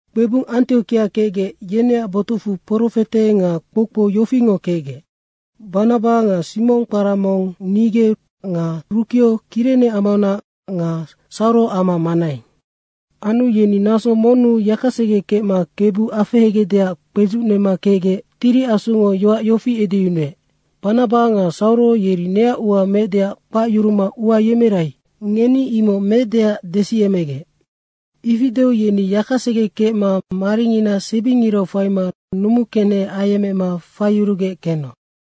Kpebung Antiokia kecgec, yeneac botucfu profete nga kpoukpou yofingo kecgec: Banaba nga Simong, kpara mong Nige, Rukeo Kirene amaunac nga Sauro amma Manaeng. Anu yeni naso monnu yakasege kecma Kebu afehegecdeac kpedzucnema kecgec Tiri Asungo yoac yofi edeyunuec, “Banaba nga Sauro yeri neac ua meecdeac kpacyuruma ua yemerai, ngeni imoc meecdeac desiyecmegec.” Ifi deu yeni yakasege kecma maringina sebingirau faima numukenehe ayecmema faiyurugec kenoc.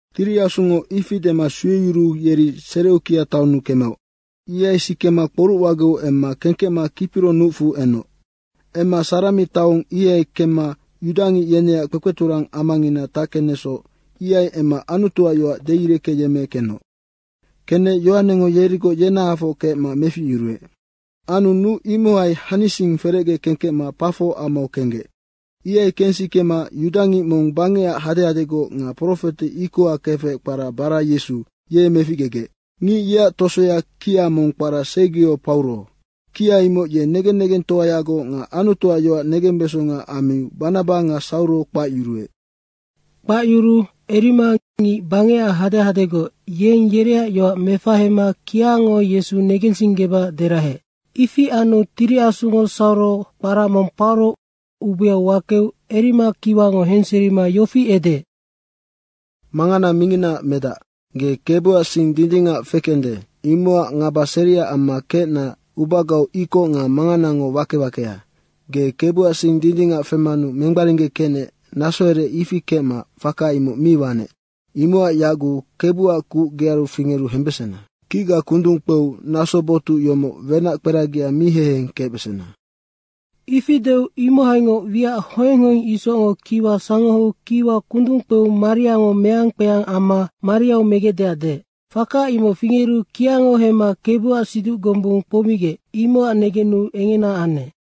Tiri Asungo ifi dema sueyuruu yeri Sereukia taonnu kemeoc. Ihai sikema kporucwageu emma kengkecma Kipiro nucfu enoc. Emma Sarami taong ihai kemma yudangic yeneac kpekpeturang amangina tackenecsoc, ihai emma Anutuac yoac deireckeyemmekenoc. Kenec Yohanengo yerigoc yenahafoc kecma meficyuruec. Anu nuc imohai hanising ferecge kengkecma Pafo amau kenggec. Ihai kensikema yudangic mong bangecac hadehadegoc nga profete ikoha kefec kpara Bara Yesu, ye meficgegec. Ngic yeac tosoya kia mong kpara Sergio Pauro. Kia imoc ye negen negengtoayagoc nga Anutuac yoac negembesonga ammiu Banaba nga Sauro kpacyuruec. Kpacyuruu Erima, ngic bangecac hadehadegoc, yeng yereac yoac mefahema kiango Yesu negensinggebacac deraheec. Ifi anu Tiri Asungo Sauro, kpara mong Pauro ubeau wakeu Erima kiwango henseriserima yofi edeec, “Mangana minginaac medac, ge Kebuac sing dindingac fekende, imocac ngaba seria amma kecna ubagau ikoc nga manganango wake wakea. Ge Kebuac sing dindingac femanu mengbaringgekecnec nasoherec ifi kecma faka imoc mi wanec. Imocac yaguc Kebuac kuc gearu fingeru hembesena. Kicga kundung kpeu naso botuc yomoc wenac kperagia mi heheng kecbesena.” Ifi deu imohaingoc wiac hoeng hoeng isocngo kiwa sangoheu kiwa kundung kpeu mariango meang kpeang amma mariau megecdeac deec. Faka imoc fingeru kiango hemma Kebuac siduc gombung kpoumigec, imocac negenu engena anec.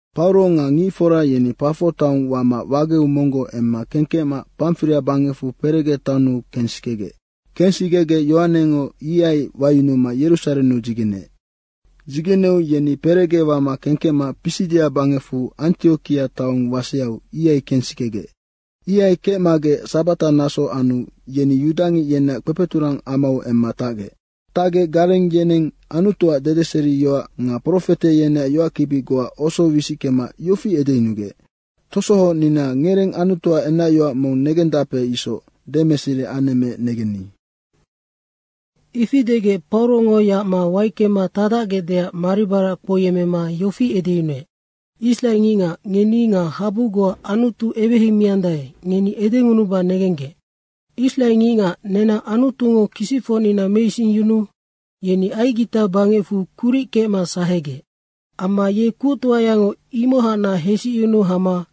Pauro nga ngicfora yeni Pafo taong wama wageu monggoc emma kengkecma Pamfiria bangecfu Perege taonnu kensikegec. Kensikegec Yohanengo ihai wayunuma Yerusarennu dzigeneec. Dzigeneu yeni Perege wama kengkecma Pisidia bangecfu Antiokia taong waseau, ihai kensikegec. Ihai kecmagec sabata naso anu yeni yudangic yeneac kpekpeturang amau emma tacgec. Tacgec gareng yeneng Anutuac dedeseriyoac nga profete yeneac yoackibi goa oso wisickema yofi edeyunugec, “Tosohocnina ngereng Anutuac enacyoac mong negendape isoc demeseri anemmeec negenni.” Ifi degec Paurongo yacma waickema tacdacgecdeac maribarac kpouyemmema yofi edeyunuec, “Israengicngac, ngeni nga habu goa Anutu eweheimiandae, ngeni edengunuba negenggec: Israengicngac nenang Anutungo kisicfocnina meisingyunuu yeni Aigita bangecfu kuric kecma sahegec. Amma ye kuctoayango imohacnac hesicyunu hama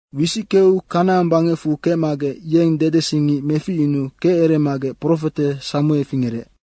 Wisickeu Kanaang bangecfu kecmagec yeng dedesingic meficyunuu keceremagec profete Samue fingerec.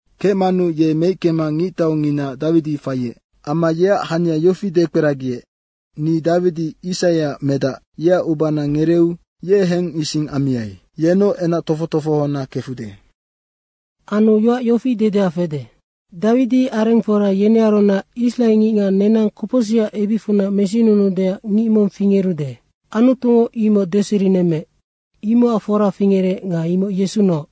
Kecmanu ye meickema ngictaungina Dawidi faiec. Amma yeac hania yofi dekperagiec, ‘Ni Dawidi, Isaiac medac yeac ubana ngereeu ye hengising ammiai. Yennoc enac tofoc tofohona kefude.’” “Anu yoac yofi dedea fede, ‘Dawidi arengfora yenearunac israengicngac nenang kopocsicac ebicfunac mesinunuudeac ngic mong fingerude.’ Anutungo imoc deserinemmeec, imocac fora fingerec nga imoc Yesunoc.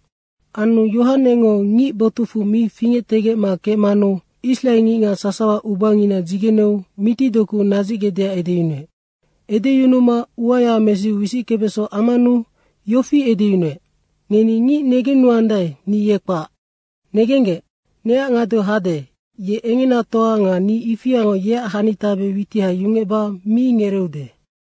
Anu Yohanengo ngic botucfu mi fingectegecma kecmanu israengicngac sasawa ubangina dzigeneu mitidoku nadzicgecdeac edeyunuec. Edeyunuma uaya mesiu wisickebeso ammanu yofi edeyunuec, ‘Ngeni ngic negennuandae, ni ye kpac. Negenggec, neac ngadeu hade, ye engenatoa nga ni ifiango yeac hanitabe witiha yungecba mi ngereeude.’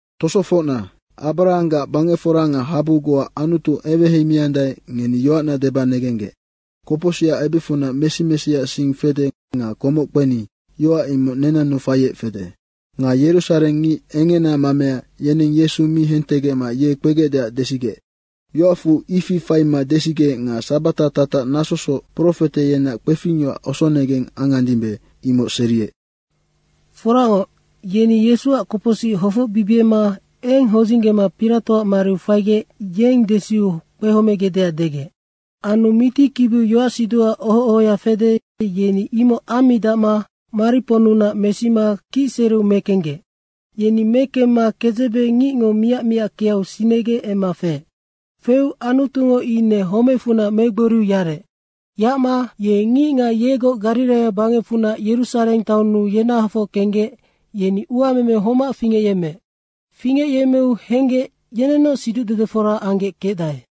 Tosofocna, Abrahanggac bangecfora nga habu goa Anutu eweheimiandae, ngeni yoacna deba negenggec, kopocsicac ebicfunac mesi mesiac sing fede nga komoc kpeni, yoac imoc nenannu faiec fede. Nga Yerusareng ngic engena mamea, yeneng Yesu mi hentegecma ye kpegecdeac desigec. Yoacfu ifi faima desigec nga sabata tatac nasosoc profete yeneac kpefingyoac osonegeng angandimbe, imoc seriec. Foracngoc, yeni Yesuac kopocsic hofocbibiema eng hodzinggema Piratoac mariu faigec, yeng desiu kpehomegecdeac degec. Anu mitikibiu yoacsiduha oho ohoya fede, yeni imoc ammidacma mariponnunac mesima kicsereu mekenggec. Yeni mekemma kedzebe ngicngo miac miackeau sinegec emma feec. Feu Anutungo ine homecfunac megboriu yarec. Yacma ye ngicngac yegoc Gariraia bangecfunac Yerusareng taonnu yenahafoc kenggec, yeni uameme homac fingecyemmeec. Fingecyemmeu henggec, yenennoc siducdedefora anggec kecdae.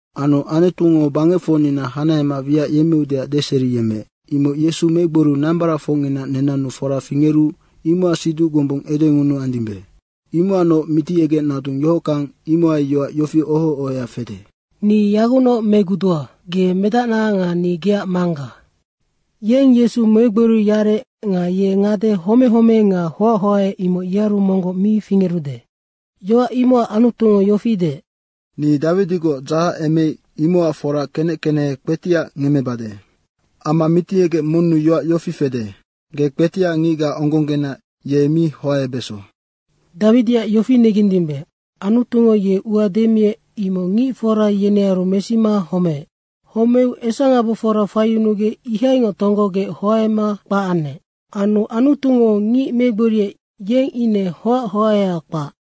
Anu Antungo bangecfocnina hanahema wiac yemmeudeac deseriyemmeec, imoc Yesu megboriu nambaracfocngina nenannu fora fingeru imocac siduc gombung edengunuandimbe. Imocacnoc Mitiyegec nadung yohockang, imohai yoac yofi oho ohoya fede, ‘Ni yagucnoc megudua. Ge medacna nga ni geac Mangga.’ Yeng Yesu megboriu yarec nga ye ngade homehome nga hoachoae imoc yearu monggoc mi fingerude. Yoac imocac Anutungo yofi deec, ‘Ni Dawidigoc dzahacemeic, imocac fora kenec kenehe kpetiac ngemmebade.’ Amma Mitiyegec monnu yoac yofi fede, ‘Ge kpetiac ngicga onggongena ye mi hoaebeso.’ Dawidiac yofi negendimbe, Anutungo ye ua demiec, imoc ngicfora yenearu mesima homeec. Homeu esangabofora faiyunugec, ihaingoc tonggogec hoaema kpac anec. Anu Anutungo ngic megboriec, yeng ine hoac hoaea kpac.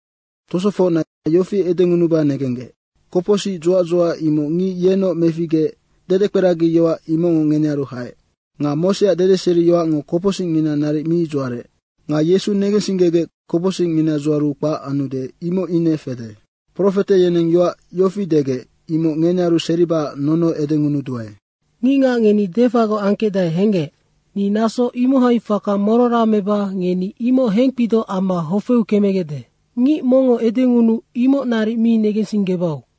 Tosofocna yofi edengunuba negenggec: Kopocsic dzuac dzuac, imoc ngic yennoc meficgeec, dedekperagi yoac imocngo ngenearu haec. Nga Moseac dedeseriyoacngo kopocsicngina naric mi dzuarec. Nga Yesu negensinggegec kopocsicngina dzuaru kpac anude, imoc ine fede. Profete yeneng yoac yofi degec, imoc ngenearu seribacac nono edengunuduae. ‘Ngicngac ngeni defagoc angkecdae henggec. Ni naso imohai faka morora meba ngeni imoc hengkpidoc amma hofeu kemegecde. Ngic mongngo edengunuu imoc naric mi negensinggebau.’”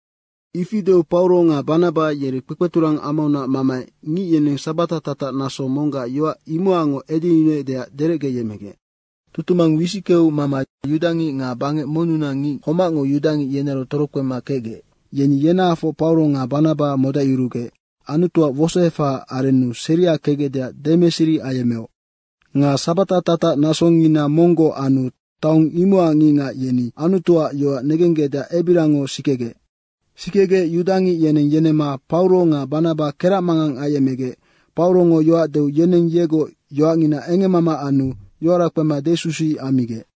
Ifi deu Pauro nga Banaba yeri kpekpeturang amaunac mamaec ngic yeneng sabata tatac naso monggac yoac imocacngoc edeyunuecdeac derecgeyemecgec. Tutumang wisickeu mama yudangic nga bangec monnunac ngic homacngo yudangic yenearu torokpema kecgec, yeni yenahafocngoc Pauro nga Banaba modacyurugec Anutuac wosoefahaac arennu seria kecgecdeac demeseri ayemmeoc. Nga sabata tatac nasongina monggoc anu taong imocac ngicngac yeni Anutuac yoac negenggecdeac ebiriango sikegec. Sikegec yudangic yeneng yenemma Pauro nga Banaba keracmangang ayecmegec Paurongo yoac deu yeneng yegoc yoacngina engemmama anu yoara kpema desusuic ammigec.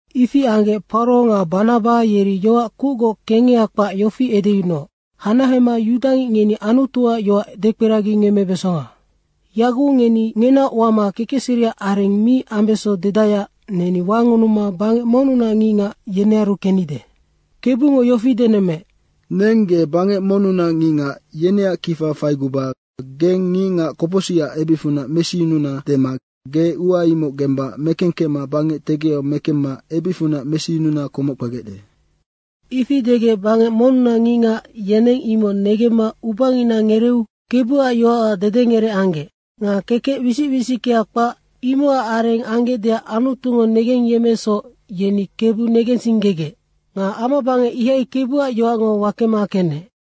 Ifi anggec Pauro nga Banaba yeri yoac kucgoc kengeha kpac yofi edeyunuoc, “Hanahema yudangic ngeni Anutuac yoac dekperagingemmebesonga. Yaguc ngeni ngenaoc wama kekecseriac areng mi ambeso dedaeac neni wangunuma bangec monnunac ngicngac, yenearu kennide. Kebungo yofi denemmeec, ‘Neng ge bangec monnunac ngicngac, yeneac kifa faiguba geng ngicngac kopocsicac ebicfunac mesiyununa dema ge ua imoc gemba mekengkecma bangec tegiau mekemma ebicfunac mesiyununa komoc kpegecde.’” Ifi degec bangec monnunac ngicngac, yeneng imoc negemma ubangina ngereeu Kebuac yoacac dedengerec anggec. Nga kekec wisic wisickea kpac, imocac areng anggecdeac Anutungo negengyemmeecsoc, yeni Kebu negensinggegec. Nga amabangec ihai Kebuac yoacngo wakema kenec.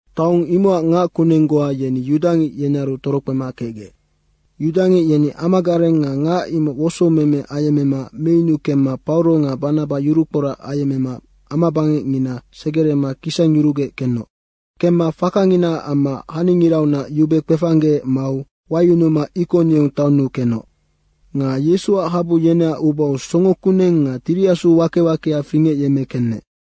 Taong imocac ngac kuneng goa yeni yudangic yenearu torokpema kecgec. Yudangic yeni amagareng nga ngac imoc wosoumeme ayemmema meyunu kemma Pauro nga Banaba yurukporac ayecmema amabangecngina segerema kisangyurugec kenoc. Kemma fakanginaac amma haningiraunac yube kpefanggeec mau wayunuma Ikoniong taonnu kenoc. Nga Yesuac habu yeneac ubau songo kuneng nga Tiri Asu wake wakea fingecyemme kenec.